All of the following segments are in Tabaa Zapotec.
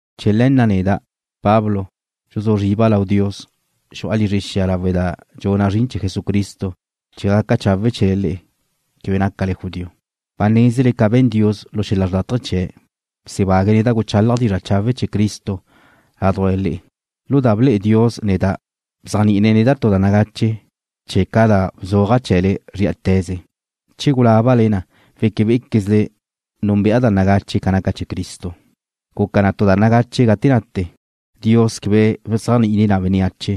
Chee̱ le̱ na' neda', Pablo, dxuzú zriba' lau Dios. Xu'a lizre xia lawe' da dxuna' zrin chee̱ Jesucristo chee̱ gaca chawe' chee̱le le'e, quebe nácale judío. Ba nézele ca be̱n Dios lu xel-la xrlátaje chee̱', bsebague̱' neda' guchálaja' dizra' chawe' chee̱ Cristo ládujla le'e. Lu da ble'e Dios neda' bzéajni'ine̱' neda' tu da nagache chee̱' ca da bzuaja' chee̱le nedxu. Gate gulábale na weque bé'equezle núnbe'a da nagache ca naca chee̱ Cristo. Guca na tu da nagache gate nate. Dios quebe bzéajni'ine̱' na bénneache,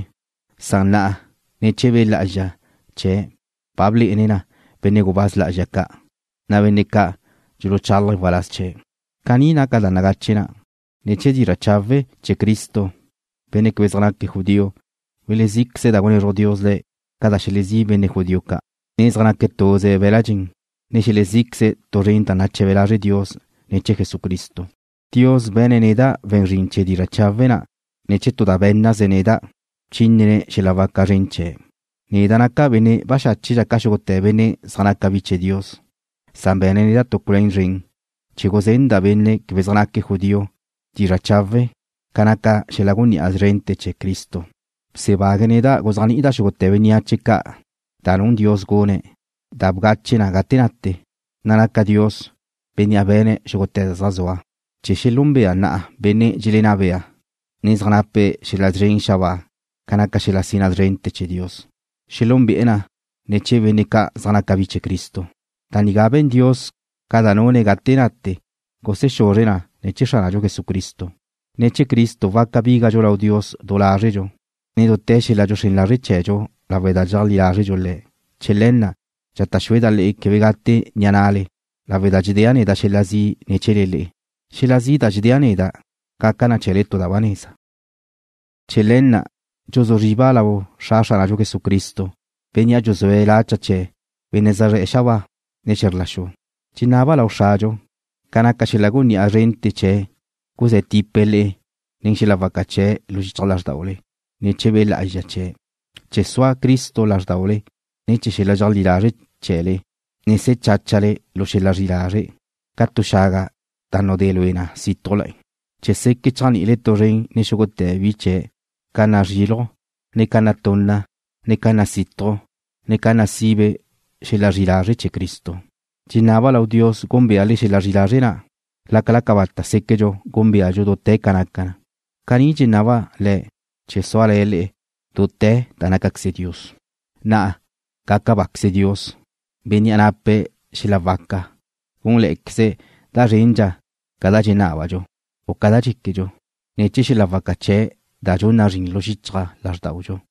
san na'a ne̱ chee̱ Be' Lá'azxa chee̱' ba blé'ene̱' na benne' gubáz lá'azxa ca', na' benne' ca' dxuluchálaje̱' waláz chee̱'. Caní naca da nagache na': Ne̱ chee̱ dizra' chawe' chee̱ Cristo benne' quebe zaj naque̱' judío welezí'queze̱' da gunezruj Dios le̱' ca da xelezí' benne' judío ca', ne zaj naque̱' tuze be̱l-la' dxen, ne xelezí'queze̱' tu zren da nache̱be lazre' Dios ne̱ chee̱ Jesucristo. Dios be̱ne̱' neda' we̱n zrin chee̱ dizra' chawe' na' ne̱ chee̱ tu da bé̱nnaze̱' neda', bchínene̱' xel-la waca zren chee̱'. Neda' nácadxa' benne' baxáche ca xúgute̱ benne' zaj naca bi chee̱ Dios. Be̱ne̱' neda' tu culuén zren chee̱ guzenda' benne' quebe zaj naque̱' judío dizra' chawe' ca naca xel-la gunní'a zrente̱ chee̱ Cristo. Bsebague̱' neda' guzéajni'ida' xúgute̱ bénneache ca da nun Dios gune̱' da bgache gate nate, na' naca Dios Bénnea' be̱ne̱' xúgute̱ da zaj zua, chee̱ xelúnbea na'a benne' dxelenná be'e̱, ne zaj nape̱' xel-la szren xabáa ca naca xel-la sina zrente̱ chee̱ Dios. Xelúnbe'e̱ na ne̱ chee̱ benne' ca' zaj naca bi chee̱ Cristo. Da nigá be̱n Dios ca da nune̱' gate nate gusexuzre̱' ne̱ chee̱ Xránadxu Jesucristo. Ne̱ chee̱ Cristo waca bígadxu lau Dios du lázredxu, ne dute̱ xel-la dxuxrén lazre' chee̱dxu lawe' da dxeajlí lázredxu Le̱'. Chee̱ le̱ na' dxata' xúeda' le'e quebe gate ni'a na'le lawe' da dxedéa' xel-la zi' ne̱ chee̱le le'e. Xel-la zi' da dxedéa' neda' gaca na chee̱le tu da ba neza. Chee̱ le̱ na' dxuzú zriba' lau Xra Xránadxu Jesucristo, Bénnea' dxuzúe̱' la cha chee̱ benne' zaj zre̱'e̱ xabáa, ne xe̱zr la xu. Dxenaba' lau Xradxu, ca naca xel-la gunní'a zrente̱ chee̱' guzé̱ tipe̱' le'e nen xel-la waca chee̱' lu xichaj lázrdaule ne̱ chee̱ Be' Lá'azxa chee̱', chee̱ sua Cristo lázrdaule ne̱ chee̱ xel-la dxeajlí lazre' chee̱le, ne se̱ cháchale lu xel-la zri'i lazre', ca tu xaga da nudé lue na sítujla, chee̱ seque' chéajni'ile tu zren nen xúgute̱ bi chee̱' ca nazriluj, ne ca natunna, ne ca nasituj, ne ca nasibe xel-la zri'i lazre' chee̱ Cristo. Dxenaba' lau Dios gúnbeale xel-la zri'i lazre' na', lácala cabata' séquedxu gúnbeadxu dute̱ ca naca na. Caní dxenaba' Le̱' chee̱ suale̱ le'e dute̱ da nácaqueze Dios. Na'a, gaca báqueze Dios, Bénnea' nape̱' xel-la waca gúnle̱'e̱queze̱' da zrendxa ca da dxenábadxu, u ca da dxéquedxu, ne̱ chee̱ xel-la waca chee̱' da dxun na zrin lu xichaj lázrdaudxu.